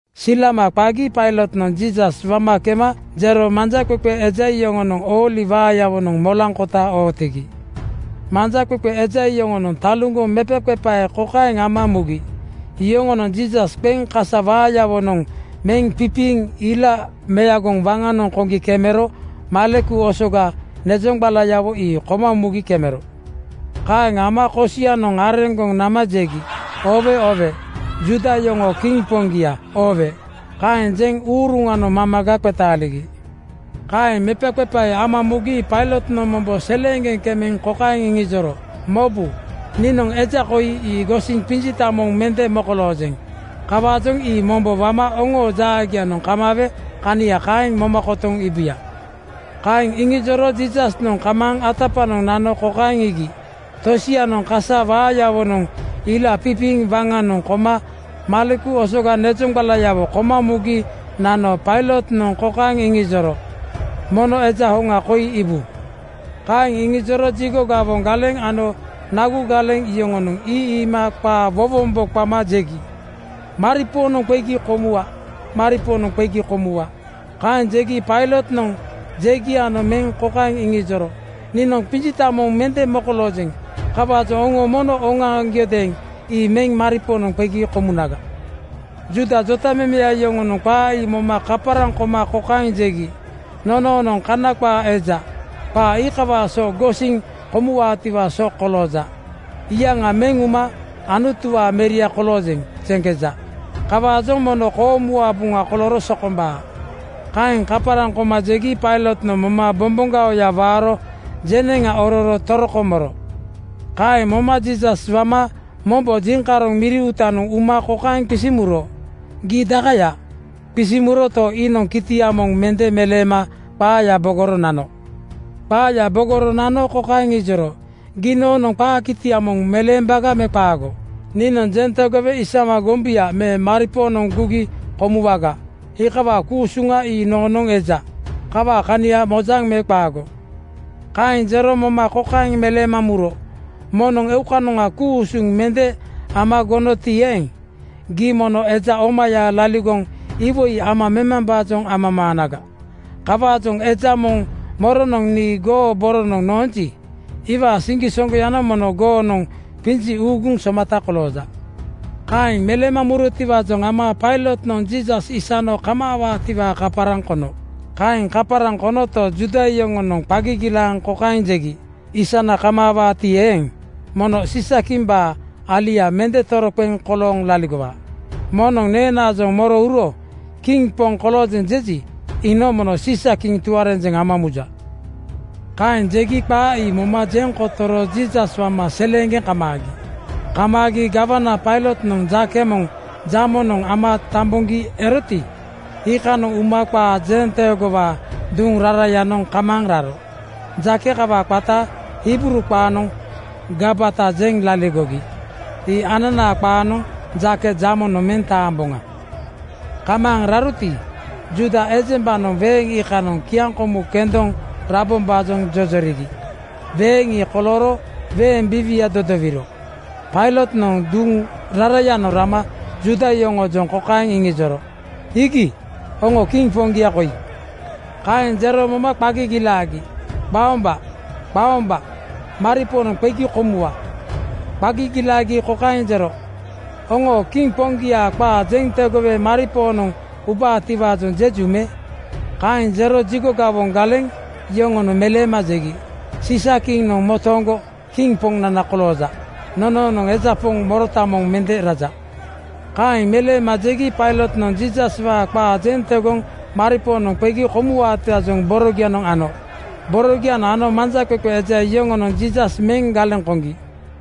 Silama qagi Pailotnoŋ Jiisas wama kema jero manjaqeqe eja yoŋonoŋ ooli waayawonoŋ molaaŋkota ootigi. Manjaqeqe eja yoŋonoŋ taluŋgoŋ mepaqepae kokaeŋ ama mugi: yoŋonoŋ Jiisas qeŋ kasa waayawo meŋ pipiiŋ ila meagoŋ waŋanoŋ koŋgi kemero maleku osoga nezoŋgbalawo ii koma mugi kemero. Kaeŋ ama kosia-noŋ areŋgoŋ nama jegi, “Oowe oowe! Juuda yoŋoo Kiŋ Poŋgia, oowe!” Kaeŋ jeŋ uruŋanoŋ mamaga qetaaligi. Kaeŋ mepaqepae ama mugi Pailotnoŋ mombo seleeŋgeŋ kemeŋ kokaeŋ iŋijoro, “Mobu! Niinoŋ eja ii gosiŋ qinjita moŋ mende mokoloojeŋ. Kawaajoŋ ii mombo wama oŋoo jaagianoŋ kamaawe kania kaeŋ moma kotoŋ iibuya.” Kaeŋ iŋijoro Jiisasnoŋ kamaaŋ atapaŋanoŋ nano kokaeŋ iigi: Tosianoŋ kasa waawonoŋ ila pipiiŋ waŋanoŋ koma maleku osoga nezoŋgbalayawo koma mugi nano Pailotnoŋ kokaeŋ iŋijoro, “Mono eja hoŋa koi iibu!” Kaeŋ iŋijoro jigo gawoŋ galeŋ ano nagu galeŋ (sikiriti) yoŋonoŋ ii iima qaa wowombo qama jegi, “Maripoonoŋ qegi komuwa. Maripoonoŋ qegi komuwa.” Kaeŋ jegi Pailotnoŋ jegianoŋ meŋ kokaeŋ iŋijoro, “Niinoŋ qinjita moŋ mende mokoloojeŋ. Kawaajoŋ oŋo mono oŋoaŋgiodeeŋ ii meŋ maripoonoŋ qegi komunaga.” Juuda jotamemeya yoŋonoŋ qaa ii moma kaparaŋ koma kokaeŋ jegi, “Nonoonoŋ Kana qaa eja. Qaa iikawaa so gosiniŋ komuwaatiwaa so kolooja. Iyaŋa meŋ uma ‘Anutuwaa meria koloojeŋ,’ jeŋkeja. Kawaajoŋ mono koomuwaa buŋa kolooro sokombaa.” Kaeŋ kaparaŋ koma jegi Pailotnoŋ moma bomboŋgaoya waaro jeneŋa ororo toroko moro. Kaeŋ moma Jiisas wama mombo jiŋkaroŋ miri uutanoŋ uma kokaeŋ qisiŋ muro, “Gii daakaya?” Qisiŋ muroto, iinoŋ kitia moŋ mende meleema qaaya bogoro nano. Qaaya bogoro nano kokaeŋ ijoro, “Gii noonoŋ qaa kitia moŋ meleembaga me qaago? Niinoŋ jeŋ tegowe isama gombuya me maripoonoŋ gugi komuwaga. Iikawaa ku-usuŋa ii noonoŋ eja. Kawaa kania mojaŋ me qaago?” Kaeŋ jero moma kokaeŋ meleema muro, “Moŋnoŋ eukanoŋa ku-usuŋ mende ama gonoti eeŋ, gii mono eja omaya laligoŋ iwoi ama nomambaajoŋ amamaanaga. Kawaajoŋ eja moŋ moronoŋ nii goo boronoŋ noonji, iwaa siŋgisoŋgoyanoŋ mono goonoŋ qinji uuguŋ somata kolooja.” Kaeŋ meleema murotiwaajoŋ ama Pailotnoŋ Jiisas isano kamaawaatiwaa kaparaŋ kono. Kaeŋ kaparaŋ konoto, Juuda yoŋonoŋ qa gigilaaŋ kokaeŋ jegi, “Aisna kamaawaati eeŋ, mono Siisa-kimbaa alia mende toroqeŋ kolooŋ laligowa. Moŋnoŋ neenaajoŋ moro uro ‘Kiŋ poŋ koloojeŋ’ jeji, iinoŋ mono Siisa-kiŋ tuarenjeŋ ama muja.” Kaeŋ jegi qaa ii moma jeŋ kotoro Jiisas wama seleeŋgeŋ kamaagi. Kamaagi gawana Pailotnoŋ jake moŋ jamonoŋ ama tamboŋgi eroti, iikanoŋ uma qaa jenteegowaa duŋ rarayanoŋ kamaaŋ raro. Jake kawaa qata Hibruu qaanoŋ Gabata jeŋ laligogi. Ii ananaa qaanoŋ Jake Jamonoŋ meŋ taamboŋa. Kamaaŋ raroti, Juuda ejembanoŋ weeŋ iikanoŋ kiaŋkomu kendoŋ rabombaajoŋ jojorigi. Weeŋ ii kolooro weeŋ biiwia dodowiro Pailotnoŋ duŋ rarayanoŋ rama Juuda yoŋoojoŋ kokaeŋ iŋijoro, “Iigi, oŋoo kiŋ poŋgia koi!” Kaeŋ jero moma qa gigilaagi, “Qaomba! Qaomba! Maripoonoŋ qegi komuwa!” Qa gigilaagi kokaeŋ jero, “Oŋoo kiŋ poŋgiaa qaa jeŋ tegowe maripoonoŋ ubaatiwaajoŋ jeju me?” Kaeŋ jero jigo gawoŋ galeŋ yoŋonoŋ meleema jegi, “Siisa-kiŋnoŋ motooŋgo kiŋ poŋnana kolooja. Nonoonoŋ eja poŋ morota moŋ mende raja.” Kaeŋ meleema jegi Pailotnoŋ Jiisaswaa qaa jeŋ tegoŋ maripoonoŋ qegi komuwaatiwaajoŋ borogianoŋ ano. Borogianoŋ ano manjaqeqe eja yoŋonoŋ Jiisas meŋ galeŋ koŋgi.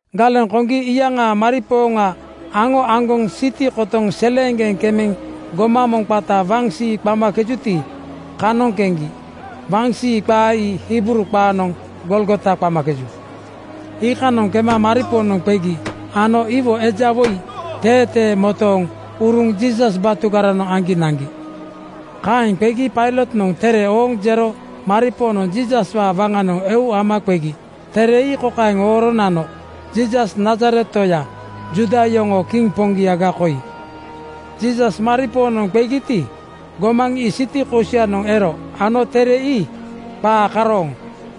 Galeŋ koŋgi iyaŋaa maripooŋa aŋo aŋgoŋ siti kotoŋ seleeŋgeŋ kemeŋ gomaŋ moŋ qata Waŋsii qamakejuti, kanoŋ keŋgi. Waŋsii qa ii Hibruu qaanoŋ Golgota qamakeju. Iikanoŋ kema maripoonoŋ qegi ano iwo eja woi teetee motooŋ uruŋ Jiisas batugaranoŋ aŋgi naŋgi. Kaeŋ qegi Pailotnoŋ tere ooŋ jero maripoonoŋ Jiisaswaa waŋanoŋ eu ama qegi. Tere ii kokaeŋ ooro nano, “Jiisas Nazaret toya, Juuda yoŋoo kiŋ poŋgiaga koi.” Jiisas maripoonoŋ qegiti, gomaŋ ii siti kosianoŋ ero ano tere ii qaa karooŋ,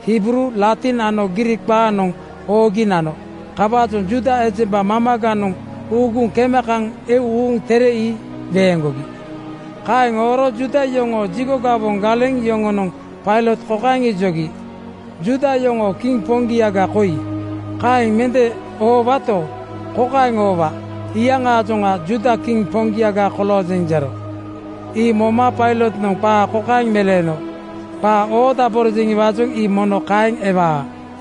Hibruu, Latin ano Griik qaanoŋ oogi nano. Kawaajoŋ Juuda ejemba mamaganoŋ uuguŋ kema kaŋ eu uuŋ tere ii weeŋgogi. Kaeŋ ooro Juuda yoŋoo jigo gawoŋ galeŋ yoŋonoŋ Pailot kokaeŋ ijogi, “‘Juuda yoŋoo kiŋ poŋgiaga koi,’ kaeŋ mende oowato, kokaeŋ oowa, ‘Iyaŋaajoŋa Juuda kiŋ Poŋgiaga koloojeŋ, jero.’” Ii moma Pailotnoŋ qaa kokaeŋ meleeno, “Qaa oodaborojeŋiwaajoŋ ii mono kaeŋ ewaa.”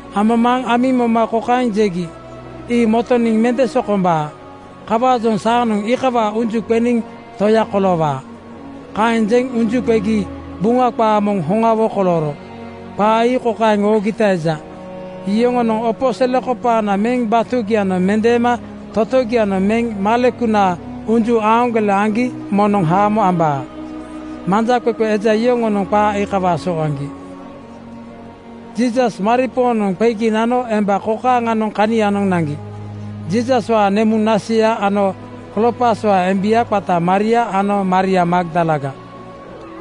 Amamaaŋ amiŋ moma kokaeŋ jegi, “Ii motoniŋ mende sokombaa. Kawaajoŋ saanoŋ iikawaa unju qeniŋ toya koloowaa.” Kaeŋ jeŋ unju qegi Buŋa qaa moŋ hoŋawo kolooro. Qaa ii kokaeŋ oogita eja, “Yoŋonoŋ opo selekopaana meŋ batugianoŋ mendeema totogianoŋ meŋ malekunaa unju aaŋgole aŋgi moŋnoŋ haamo ambaa.” Manjaqeqe eja yoŋonoŋ qaa iikawaa so aŋgi. Jiisas maripoonoŋ qegi nano emba kokaaŋanoŋ kanianoŋ naŋgi: Jiisaswaa nemuŋ naseya ano Kloopaswaa embia qata Maria ano Maria Magdalaga.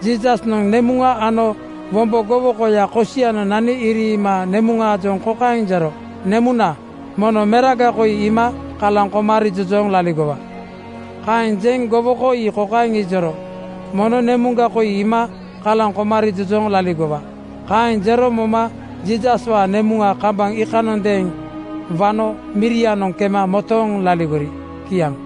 Jiisasnoŋ nemuŋa ano wombo gowokoya kosianoŋ nani iriima nemuŋaajoŋ kokaeŋ jero, “Nemuna, mono meraga koi iima kalaŋ koma rijojooŋ laligowa.” Kaeŋ jeŋ gowoko ii kokaeŋ ijoro, “Mono nemuŋga koi iima kalaŋ koma rijojooŋ laligowa.” Kaeŋ jero moma Jiisaswaa nemuŋa kambaŋ iikanondeeŋ wano mirianoŋ kema motooŋ laligori. Kiaŋ.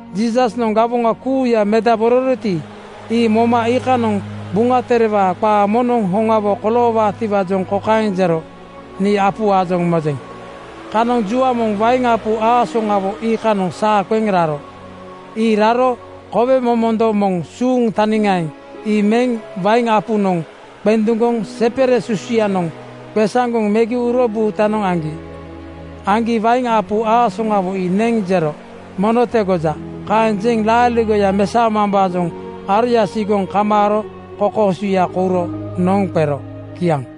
Jiisasnoŋ gawoŋa kuuya medabororoti, ii moma iikanoŋ Buŋa Terewaa qaaya moŋnoŋ hoŋawo koloowaatiwaajoŋ kokaeŋ jero, “Nii apuwaajoŋ mojeŋ.” Kanoŋ jua moŋ wain apu aasoŋawo iikanoŋ saa qeŋ raro. Ii raro kowe momondo moŋ suuŋ taniŋaeŋ ii meŋ wain apunoŋ qenduŋgoŋ sepere susuyanoŋ qesaŋgoŋ megi uro buutanoŋ aŋgi. Aŋgi wain apu aasoŋawo ii neŋ jero, “Mono tegoja.” Kaeŋ jeŋ laaligoya mesao-mambaajoŋ aroya sigoŋ kamaaro kokoosuya kouro noŋ qero. Kiaŋ.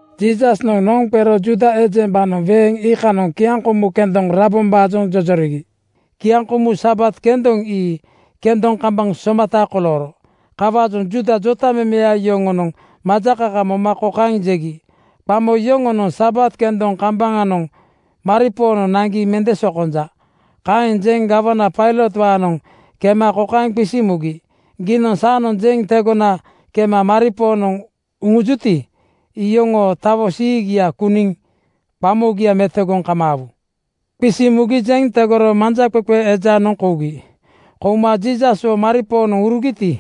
Jiisasnoŋ noŋ qero Juuda ejembanoŋ weeŋ iikanoŋ kiaŋkomu kendoŋ rabombaajoŋ jojorigi. Kiaŋkomu Sabat kendoŋ ii kendoŋ kambaŋ somata kolooro. Kawaajoŋ Juuda jotamemeya yoŋonoŋ majakaka moma kokaeŋ jegi, “Qamo yoŋonoŋ Sabat kendoŋ kambaŋanoŋ maripoonoŋ naŋgi mende sokonja.” Kaeŋ jeŋ gawana Pailotwaanoŋ kema kokaeŋ qisiŋ mugi, “Gii saanoŋ jeŋ tegona kema maripoonoŋ uŋujuyati, iyoŋoo tawo siigia kuŋgi qamogia metogoniŋ kamaawuya?” Qisiŋ mugi jeŋ tegoro manjaqeqe ejanoŋ kougi. Kouma Jiisaswo maripoonoŋ urugiti,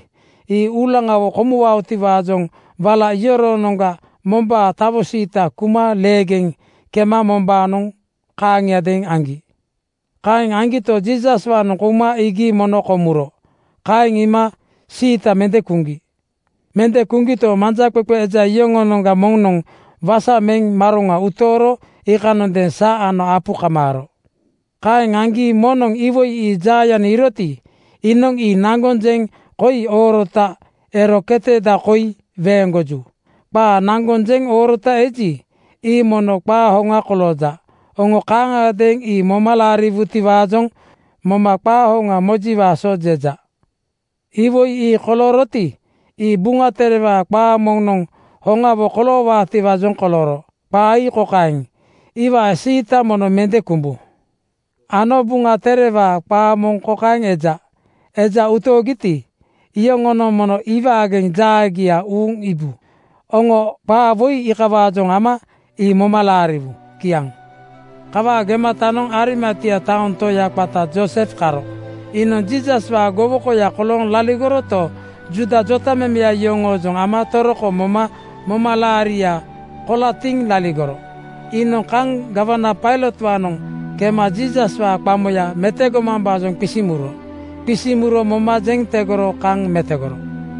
ii uulaŋawo komuwaotiwaajoŋ wala yoroonoŋga mombaa tawo siita kuma leegeŋ kema mombaanoŋ kaaŋiadeeŋ aŋgi. Kaeŋ aŋgito, Jiisaswaanoŋ kouma iigi mono komuro. Kaeŋ iima siita mende kuŋgi. Mende kuŋgito, manjaqeqe eja yoŋoo-noŋga moŋnoŋ wasa meŋ maroŋa utooro iikanondeeŋ sa ano apu kamaaro. Kaeŋ aŋgi moŋnoŋ iwoi ii jaayanoŋ iiroti, iinoŋ ii naŋgoŋ jeŋ koi oorota ero keteda koi weeŋgoju. Qaa naŋgoŋ jeŋ oorota eji, ii mono qaa hoŋa kolooja. Oŋo kaaŋagadeeŋ ii moma laariwuti-waajoŋ moma qaa hoŋa mojiwaa so jeja. Iwoi ii kolooroti, ii Buŋa Terewaa qaa moŋnoŋ hoŋawo koloowaatiwaajoŋ kolooro. Qaa ii kokaeŋ, “Iwaa siita mono mende kumbu.” Ano Buŋa Terewaa qaa moŋ kokaeŋ eja, “Eja utoogiti, iyoŋonoŋ mono iwaageŋ jaagia uuŋ iibu.” Oŋo qaa woi iikawaajoŋ ama ii moma laariwu. Kiaŋ. Kawaa gematanoŋ Arimatia taoŋ toya qata Joosef karo. Iinoŋ Jiisaswaa gowokoya kolooŋ laligoroto, Juuda jotamemeya yoŋoojoŋ ama toroko moma momalaaria kolatiŋ laligoro. Iinoŋ kaŋ gawana Pailotwaanoŋ kema Jiisaswaa qamoya metogomambaajoŋ qisiŋ muro. Qisiŋ muro moma jeŋ tegoro kaŋ metogoro.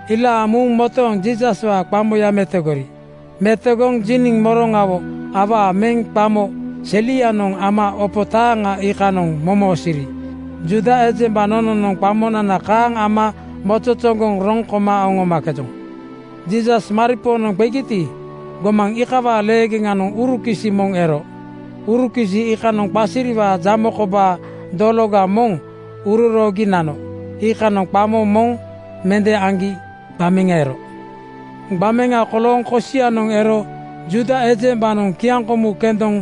Ilaaŋ muŋ motooŋ Jiisaswaa qamoya metogori. Metogoŋ jiniŋ moroŋa awaa meŋ qamo selianoŋ ama opo taaŋa iikanoŋ momosiiri. Juuda ejemba nononoŋ qamonana kaaŋ ama mozozoŋgoŋ roŋ koma oŋomakejoŋ. Jiisas maripoonoŋ qegiti, gomaŋ iikawaa leegeŋanoŋ urukisi moŋ ero. Urukisi iikanoŋ qasiriwaa jamo kobaa dologa moŋ uroroogi nano. Iikanoŋ qamo moŋ mende aŋgi gbameŋa ero. Gbameŋa kolooŋ kosianoŋ ero Juuda ejembanoŋ kiaŋkomu kendoŋ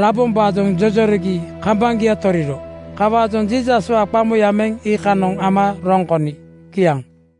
rabombaajoŋ jojorigi kambaŋgia toriro. Kawaajoŋ Jiisaswaa qamoya meŋ iikanoŋ ama roŋ koni. Kiaŋ.